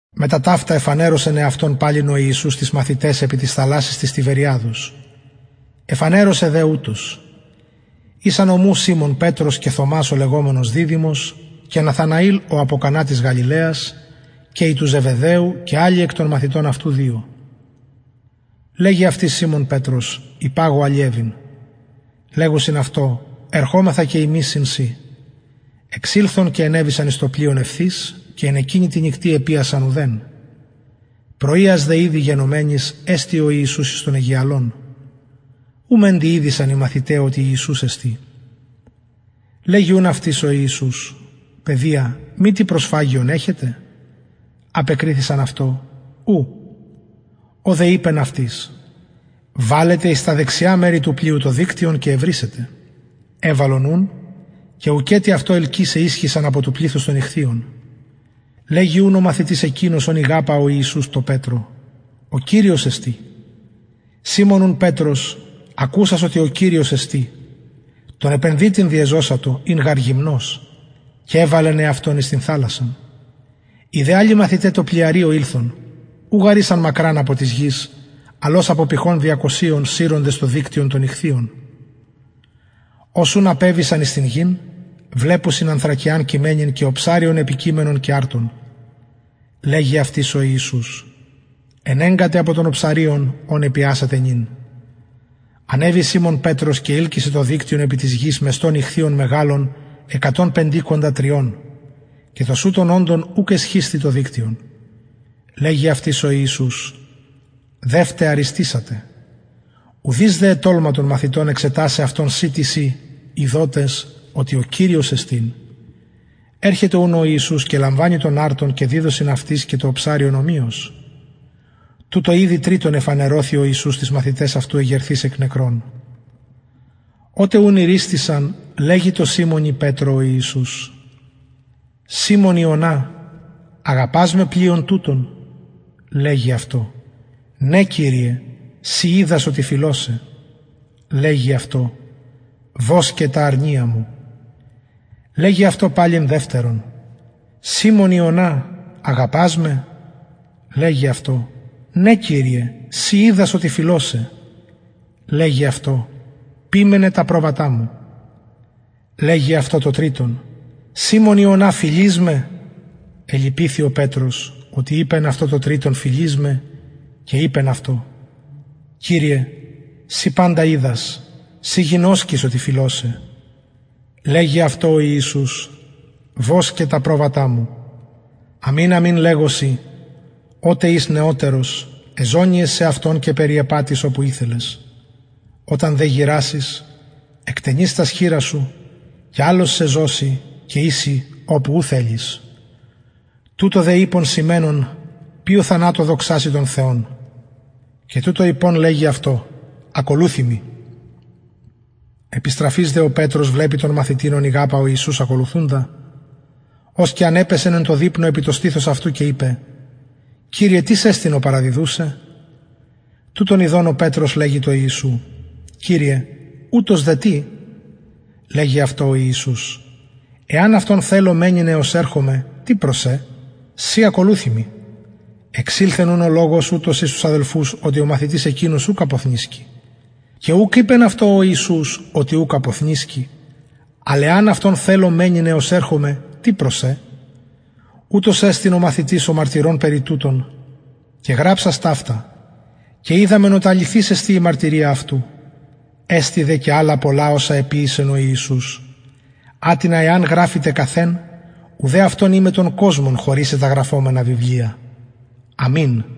μετα ταυτα εφανερωσεν εαυτον παλιν ο ιησους τοις μαθηταις επι της θαλασσης της τιβεριαδος εφανερωσεν δε ουτως ησαν ομου σιμων πετρος και θωμας ο λεγομενος διδυμος και ναθαναηλ ο απο κανα της γαλιλαιας και οι του ζεβεδαιου και αλλοι εκ των μαθητων αυτου δυο λεγει αυτοις σιμων πετρος υπαγω αλιευειν λεγουσιν αυτω ερχομεθα και ημεις συν σοι εξηλθον και ενεβησαν εις το πλοιον ευθυς και εν εκεινη τη νυκτι επιασαν ουδεν πρωιας δε ηδη γενομενης εστη ο ιησους εις τον αιγιαλον ου μεντοι ηδεισαν οι μαθηται οτι ιησους εστιν λεγει ουν αυτοις ο ιησους παιδια μη τι προσφαγιον εχετε απεκριθησαν αυτω ου ο δε ειπεν αυτοις βαλετε εις τα δεξια μερη του πλοιου το δικτυον και ευρησετε εβαλον ουν και ουκετι αυτο ελκυσαι ισχυσαν απο του πληθους των ιχθυων λεγει ουν ο μαθητης εκεινος ον ηγαπα ο ιησους τω πετρω ο κυριος εστιν σιμων ουν πετρος ακουσας οτι ο κυριος εστιν τον επενδυτην διεζωσατο ην γαρ γυμνος και εβαλεν εαυτον εις την θαλασσαν οι δε αλλοι μαθηται τω πλοιαριω ηλθον ου γαρ ησαν μακραν απο της γης αλλ ως απο πηχων διακοσιων συροντες το δικτυον των ιχθυων ως ουν απεβησαν εις την γην βλεπουσιν ανθρακιαν κειμενην και οψαριον επικειμενον και αρτον λεγει αυτοις ο ιησους ενεγκατε απο των οψαριων ων επιασατε νυν ανεβη σιμων πετρος και ειλκυσεν το δικτυον επι της γης μεστον ιχθυων μεγαλων εκατον πεντηκοντα τριων και τοσουτων οντων ουκ εσχισθη το δικτυον λεγει αυτοις ο ιησους δευτε αριστησατε ουδεις δε ετολμα των μαθητων εξετασαι αυτον συ τις ει ειδοτες οτι ο κυριος εστιν ερχεται ουν ο ιησους και λαμβανει τον αρτον και διδωσιν αυτοις και το οψαριον ομοιως τουτο ηδη τριτον εφανερωθη ο ιησους τοις μαθηταις αυτου εγερθεις εκ νεκρων οτε ουν ηριστησαν λεγει τω σιμωνι πετρω ο ιησους σιμων ιωνα αγαπας με πλειον τουτων λεγει αυτω ναι κυριε συ οιδας οτι φιλω σε λεγει αυτω βοσκε τα αρνια μου λεγει αυτω παλιν δευτερον σιμων ιωνα αγαπας με λεγει αυτω ναι κυριε συ οιδας οτι φιλω σε λεγει αυτω ποιμαινε τα προβατα μου λεγει αυτω το τριτον σιμων ιωνα φιλεις με ελυπηθη ο πετρος οτι ειπεν αυτω το τριτον φιλεις με και ειπεν αυτω κυριε συ παντα οιδας συ γινωσκεις οτι φιλω σε λεγει αυτω ο ιησους βοσκε τα προβατα μου αμην αμην λεγω σοι οτε ης νεωτερος εζωννυες σεαυτον και περιεπατεις οπου ηθελες οταν δε γηρασης εκτενεις τας χειρας σου και αλλος σε ζωσει και οισει οπου ου θελεις τουτο δε ειπεν σημαινων ποιω θανατω δοξασει τον θεον και τουτο ειπων λεγει αυτω ακολουθει μοι επιστραφεις δε ο πετρος βλεπει τον μαθητην ον ηγαπα ο ιησους ακολουθουντα ος και ανεπεσεν εν τω δειπνω επι το στηθος αυτου και ειπεν κυριε τις εστιν ο παραδιδους σε τουτον ιδων ο πετρος λεγει τω ιησου κυριε ουτος δε τι λεγει αυτω ο ιησους εαν αυτον θελω μενειν εως ερχομαι τι προς σε συ ακολουθει μοι εξηλθεν ουν ο λογος ουτος εις τους αδελφους οτι ο μαθητης εκεινος ουκ αποθνησκει και ουκ ειπεν αυτω ο ιησους οτι ουκ αποθνησκει αλλ εαν αυτον θελω μενειν εως ερχομαι τι προς σε ουτος εστιν ο μαθητης ο μαρτυρων περι τουτων και γραψας ταυτα και οιδαμεν οτι αληθης εστιν η μαρτυρια αυτου εστιν δε και αλλα πολλα οσα εποιησεν ο ιησους ατινα εαν γραφηται καθ εν ουδε αυτον οιμαι τον κοσμον χωρησαι τα γραφομενα βιβλια αμην